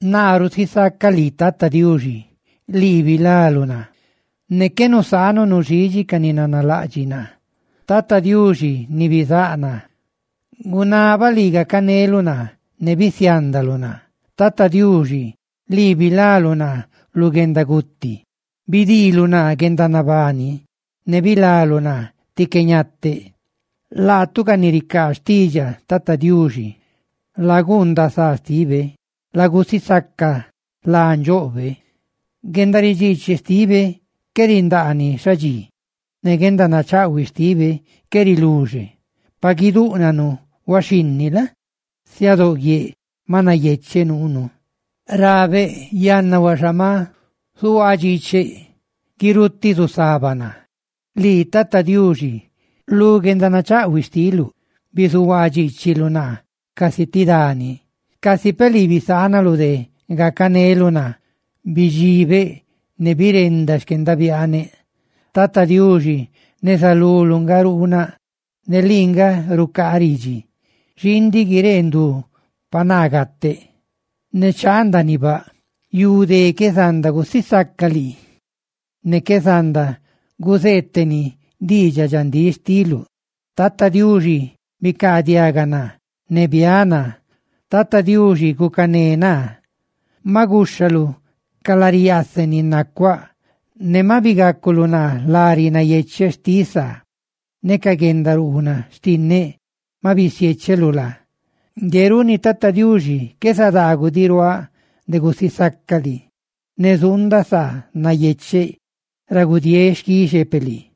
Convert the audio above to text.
Naa rusisacaꞌ lii, Tata Diuxi, lii bilaluꞌ naa, ne qué nusaanuꞌ nuxidxi ca ni nanalaꞌdxiꞌ naa. Tata Diuxi ni bizáꞌ naa, gunabaꞌ lii gacaneluꞌ naa, ne bisiandaluꞌ naa; Tata Diuxi, lii bilaluꞌ naa lu guendaguti; bidiiluꞌ naa guendanabani, ne bilaluꞌ naa tí qué ñateꞌ. Laatu, ca ni ricaa xtiidxaꞌ Tata Diuxi, ¡laguundaꞌ saa xtibe!, ¡lagusisaca lá ndxoꞌbe! Guendaridxiichi xtibe qué rindaani xadxi, ne guendanachaꞌhuiꞌ xtibe qué riluxe. Pa guidúꞌnanu huaxhinni la? siadóꞌ guieꞌ ma nayecheꞌ nuunú. Yanna huaxa ma zuhuaa dxiicheꞌ, naa rabeꞌ: «Guirutiꞌ zusaba naa.» Lii Tata Diuxi, lu guendanachaꞌhuiꞌ xtiluꞌ bizuhuadxiichiluꞌ naa casi ti dani, casi peꞌ lii bisaanaluꞌ de gacaneluꞌ naa bidxibeꞌ ne birenda xquendabiaaneꞌ. Tata Diuxi, neza luluꞌ nga ruunaꞌ; ne lii nga rucaa ridxi: «Xii ndiꞌ guiree ndu pa naa gateꞌ, ne chaa ndaaniꞌ baꞌ. ¡Yu dé qué zanda gusisaca lii, ne qué zanda guzeeteni diidxaꞌ dxandíꞌ xtiluꞌ! Tata Diuxi bicaadiaga naa ne biáꞌ naa; Tata Diuxi, ¡gucané naa!» Maꞌ guxhaluꞌ ca lari yaaseꞌ ni nacuáꞌ; ne maꞌ bigaculuꞌ naa lari nayecheꞌ xtiꞌ saa, ne ca guendaruunaꞌ xtinneꞌ ma bisiecheluꞌ laa. Ngue runi, Tata Diuxi, qué zadaagudiꞌ ruaaꞌ de gusisacaꞌ lii; ¡ne zuundaꞌ saa nayecheꞌ ra gudieeꞌ xquixepeꞌ lii!